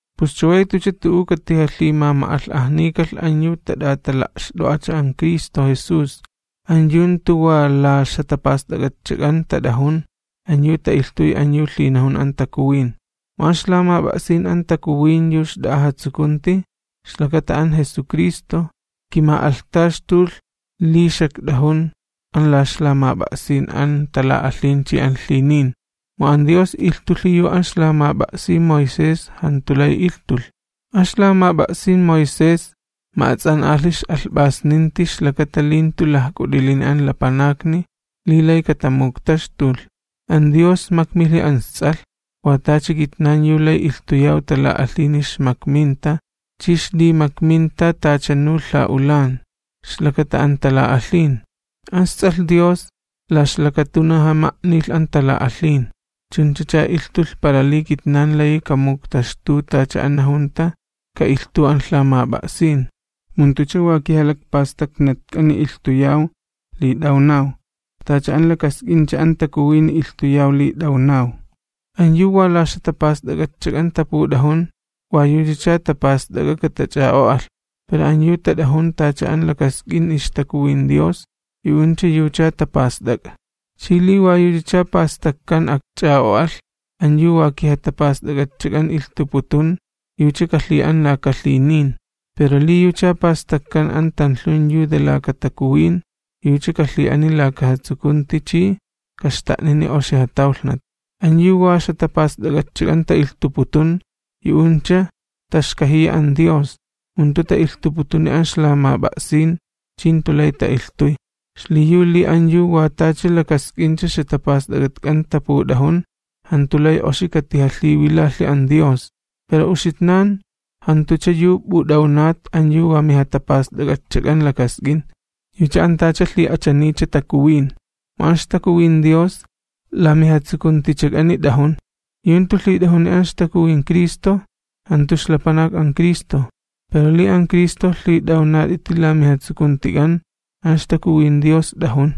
Pus chaway jantucha tu'u katijalhimama'alh'ajnikalh an yu tat'atala'xt'o'acha an Cristo Jesús, [an yu jantu wa la ixjatapast'ak'atchak'an tat'ajun, an yu ta'ilhtuy an yu lhinajun an Takuwin.] Mu an ixlamap'a'sin an Takuwin yu xt'a'a jatsukunti, ixlakata an Jesucristo, kima'alhtaxtulh li xakt'ajun an la ixlamap'a'sin an tala'alhin chi an lhinin. Mu an Dios ilhtulhi yu an ixlamap'a'sin Moisés jantu lay ilhtulh. An ixlamap'a'sin Moisés ma'ats'an'alhi ix'alhp'asninti ixlakata li jantu lajk'ut'ilini an lapanakni li lay katamuktaxtulh. An Dios makmilhi an isTs'alh, wa tacha kitnan yu lay ilhtuyaw tala'alhini ixmakminta chi ixlimakminta tachanu lha'ulan, ixlakata an tala'alhin. An isTs'alh Dios la ixlakatunaja ma'nilh an tala'alhin. Chunchacha ilhtulh para li kitnan layi kamuktaxtu tacha an najunta ka'ilhtuw an lhamap'a'sin, mu jantucha wa kijalakpastaknatk'ani ilhtuyaw li t'awnaw, tacha an lakask'incha an Takuwini ilhtuyaw li t'awnaw. An yu wa la ixjatapast'ak'atchak'an taput'ajun, wa yuchacha tapast'ak'a katach'a'o'alh, pero an yu tat'ajun tacha an lakask'in ixTakuwin Dios, yu'uncha yucha tapast'ak'a. Chi li wa yuchacha pastakkan akch'a'o'alh an yu wa kijatapast'ak'atchak'an ilhtuputun, yucha kalhi'an laka lhinin, pero li yucha pastakkan an tanlhun yu de laka Takuwin, yucha kalhi'aniy laka jatsukunti chi kaxta'nini oxi jatawlhnat. An yu wa ixjatapast'ak'atchak'an ta'ilhtuputun, yu'uncha taxkajiya an Dios, mu jantu ta'ilhtuniputuni an ixlamap'a'sin chi jantu lay ta'ilhtuy. Xliyu li an yu wa tacha lakask'incha ixjatapast'ak'atk'an taput'ajun, jantu lay oxi katijalhiwilalhi an Dios. Pero uxitnan jantucha yu p'ut'awnat an yu wa mijatapast'ak'atchak'an lakask'in, yucha an tacha lhi'achaniycha Takuwin, mu an ixTakuwin Dios la mijatsukuntichak'ani t'ajun. Yu jantu lhit'ajuni an ixTakuwin Cristo, jantu ixlapanak an Cristo. Pero li an Cristo lhit'awnat'iti la mijatsukuntik'an, an ixTakuwin Dios t'ajun,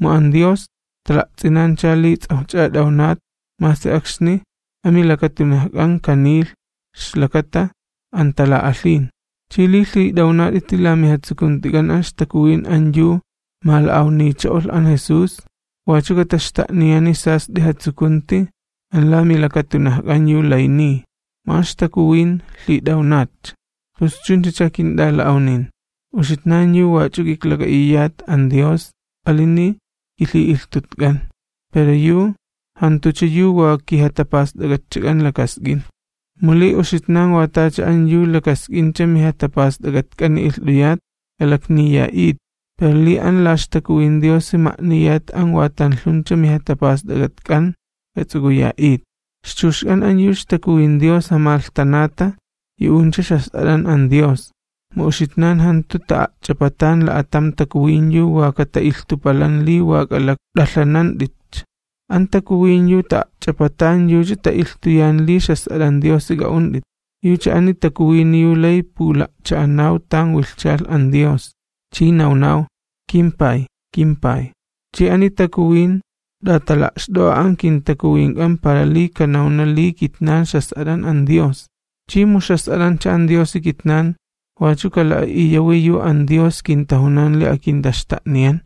mu an Dios tala'ts'inancha li ts'awjcha t'awnat masi akxni amilakatunajk'an kanilh ixlakata an tala'alhin. Chi li lhit'awnat'iti la mijatsukuntik'an an ixTakuwin an yu mala'awnicho'olh an Jesús, wachu kataxta'niyani sast'i jatsukunti an la milakatunajk'an yu lay niy, mu an ixTakuwin lhit'awnatcha. Pus chunchacha kint'ala'awnin, uxitnan yu wach'u k'iklak'a'iyat an Dios alini kilhi'ilhtutk'an, pero yu jantucha yu wa kijatapast'ak'atchak'an lakask'in. Mu li uxitnan wa tacha an yu lakask'incha mijatapast'ak'atk'ani ilht'uyat, k'alakniya'it, pero li an la ixTakuwin Diosi ma'niyat an wa tanlhuncha mijatapast'ak'atk'an, k'ats'uk'uya'it. Ixchuxk'an an yu ixTakuwin Dios jamalhtanata, yu'uncha ixjas'at'an an Dios. Mu uxitnan jantu ta'a'ch'apatan la'atam takuwin yu wa kata'ilhtupalan li wa k'alakt'alhanant'itcha, an Takuwin yu ta'a'ch'apatan yucha ta'ilhtuyan li ixjas'at'an Diosi k'a'unt'it. Yucha ani Takuwini yu lay pula'cha'anaw tan wilhchalh an Dios, chi nawnaw: “KimPay, kimPay.” Chi ani Takuwin t'atala'xt'o'a an kintakuwink'an para li kanawna li kitnan ixjas'at'an an Dios. Chi mu ixjas'at'ancha an Diosi kitnan, wachu kala'a'iyawi yu an Dios kintajunan li akintaxta'niyan,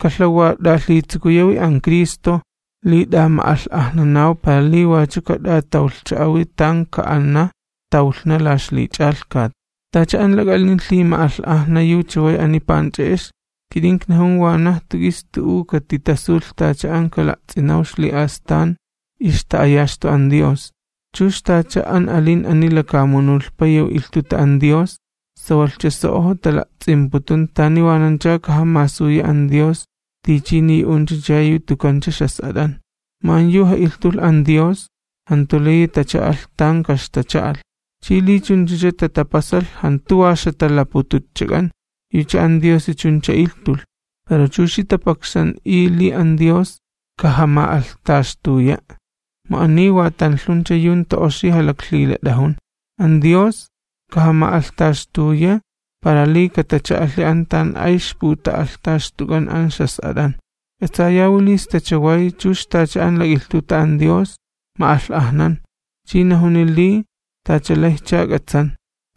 kalhawat'alhitsukuyawi an Cristo, li t'ama'alh'ajnanaw para li wachu kat'atawlhcha'awi tan ka'ana tawlhna la ixlich'alhkat. Tacha an lak'alin lhima'alh'ajna yu chaway ani panch'e'ex, kit'in iknajun wanaj jantu k'is tu'u katitasulh tacha an kala'ts'inaw ixli'astan ixta'ayaxtu an Dios. Chux tacha an alin ani lakamunulhpa yu ilhtuta an Dios, sawalhcha so'ojo tala'ts'imputun tani wanancha kajamasuya an Dios tichini yu'unchacha yu tukancha ixjas'at'an. Mu an yu ja'ilhtulh an Dios, jantu layi tacha'alh tan kaxtacha'alh. Chi li chunchacha tatapasalh jantu wa ixjatalapututchak'an, yucha an Diosi chuncha ilhtulh. Pero chuxi tapakxan'i li an Dios kajama'alhtaxtuya'. Mu ani wa tanlhuncha yu jantu oxi jalaklhilat'ajun. An Dios kajama'alhtaxtuya para li katacha'alhi an tan ay ixputa'alhtaxtuk'an an ixjas'at'an. K'atsayawi li sta chaway chux tacha an lak'ilhtuta an Dios ma'alh'ajnan, chi najuni li tachalayjcha k'atsan,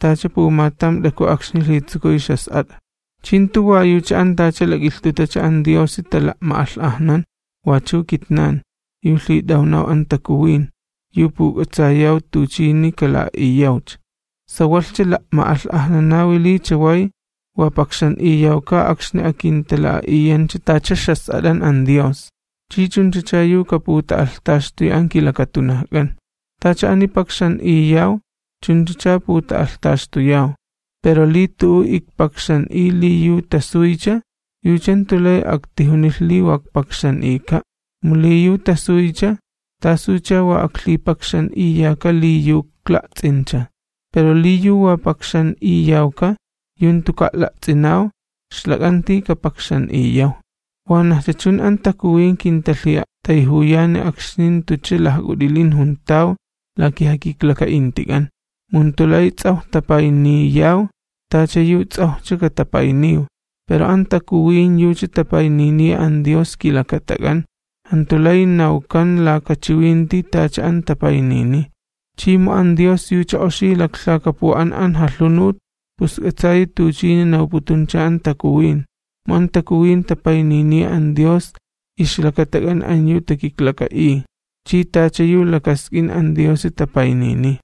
tacha pumatam t'aku akxni lhitsukuy ixjas'at'a. Chi jantu wa yucha an tacha lak'ilhtutacha an Diosi tala'ma'alh'ajnan, wachu kitnan, yu lhit'awnaw an Takuwin, yu puk'atsayaw tuchini kala'a'iyawcha. Sawalhcha la'ma'alh'ajnanawi li chaway wa pakxan'iyawka akxni akintala'a'iyancha tacha ixjas'at'an an Dios, chi chunchacha yu kaputa'alhtaxtuya an kilakatunajk'an. Tacha ani pakxan'iyaw chunchacha puta'alhtaxtuyaw, pero li tu'u ikpakxan'iy li yu tasuycha, yucha jantu lay aktijunilh li wa ikpakxan'ika', mu li yu tasuycha, ¿tasucha wa aklhipakxan'iyaka li yu ikla'ts'incha? Pero li yu wa pakxan'iyawka, yu jantuka' la'ts'inaw, ixlak'anti kapakxan'iyaw. Wanajcha chun an Takuwin kintalhi'a'tayjuyani akxni jantucha lajk'ut'ilin juntaw la kijakiklaka'intik'an. Mu jantu lay ts'awj tapayniyaw tacha yu ts'awjcha katapayniw, pero an Takuwin yucha tapayniniya an Dios kilakatak'an, jantu lay nawkan laka chiwinti tacha an tapaynini. Chi mu an Dios yucha oxi laklhakapu'an an jalhunut, pus k'atsayi tuchini nawputuncha an Takuwin, mu an Takuwin tapayniniya an Dios ixlakatak'an an yu takiklaka'iy, chi tacha yu lakask'in an Diosi tapaynini.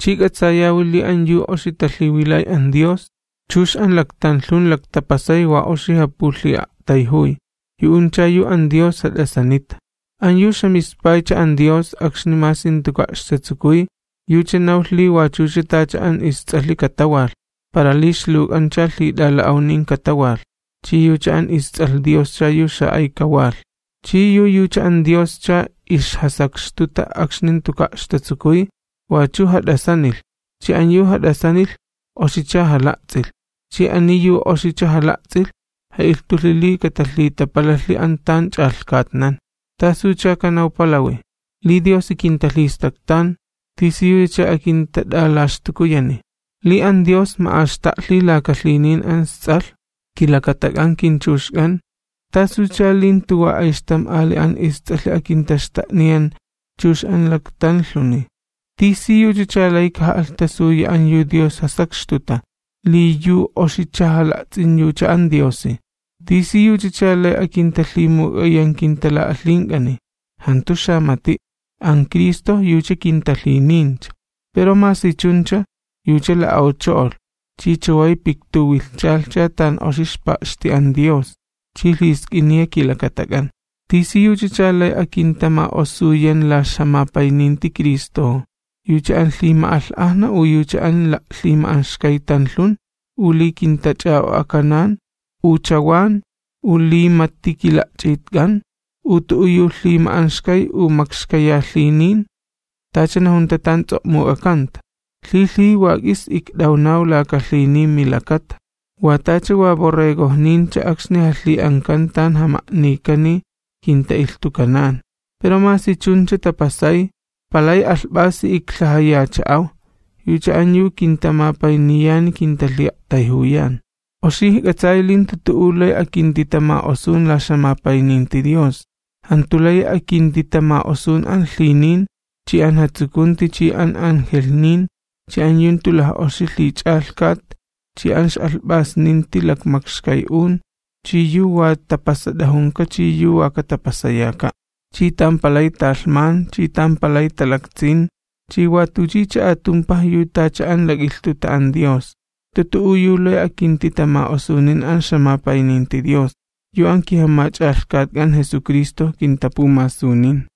Chi k'atsayawi li an yu oxi talhiwilay an Dios, chux an laktanlhun laktapasay wa oxi japulhi'a'tayjuy. Yu'uncha yu an Dios jat'asanita. An yu ixjamispaycha an Dios akxni masi jantuka' ixtatsukuy yucha nawlh li wachucha tacha an isTs'alhi katawalh, para li ixluwk'ancha lhit'ala'awnin katawalh, chi yucha an isTs'alh Dioscha yu xa'ay kawalh. Chi yu yucha an Dioscha ixjasakxtuta akxni jantuka' ixtatsukuy, wachu jat'asanilh, chi an yu jat'asanilh oxicha jala'ts'ilh, chi ani yu oxicha jala'ts'ilh ja'ilhtulhi li katalhitapalalhi an tan ch'alhkatnan. ¿Tasucha kanawpalawi? Li Diosi kintalhistaktan, ¿tisiyuchacha akintat'alaxtukuyani? Li an Dios ma'axta'lhi laka lhinin an isTs'alh kilakatak'an kinchuxk'an, ¿tasucha li jantu wa ayxtam ali an isTs'alhi akintaxta'niyan chux an laktanlhuni? ¿Tisiyuchacha lay kaja'alhtasuya an yu Dios jasakxtuta, li yu oxicha jala'ts'in yucha an Diosi? ¿Tisiyuchacha lay akintalhimuk'ayan kintala'alhink'ani? Jantu xamati', an Cristo yucha kintalhinincha, pero masi chuncha, yucha la'awcho'olh chi chaway piktuwilhchalhcha tan oxi ixpa'xti an Dios chi lhisk'iniya kilakatak'an. ¿Tisiyuchacha lay akintama'osuyan la ixjamapayninti Cristojo? ¿Yucha an lhima'alh'ajna u yucha an la'lhima'anxkay tanlhun u li kintach'a'o'akanan u chawan u li mati kila'ch'itk'an u tu'u yu lhima'anxkay u makxkayalhinin? Tacha najunta tan ts'o'muk'akanta: Lhilhiji wa k'is ikt'awnaw laka lhinin milakata, Wa tacha wa borregojnincha akxni jalhi'ankan tan jama'nikani kinta'ilhtukanan. Pero masi chuncha tapasay palay alhp'asi iklhajayacha'aw, yucha an yu kintamapayniyani kintalhi'a'tayjuyan. Oxi ijk'atsay li jantu tu'u lay akintitama'osun la ixjamapayninti Dios. Jantu layi akintitama'osun an lhinin chi an jatsukunti chi an angelhnin chi an yu jantu laj'oxi lhich'alhkat chi an ix'alhp'asninti lakmakxkay'un chi yu wa tapasat'ajunka chi yu wa katapasayaka', chi tan palay talhman chi tan palay talaktsin, chi wa tuchicha atumpaj yu tacha an lak'ilhtuta an Dios. Jantu tu'u yu lay akintitama'osunin an ixjamapayninti Dios, yu an kiJamach'alhkatk'an Jesucristo kintapumasunin.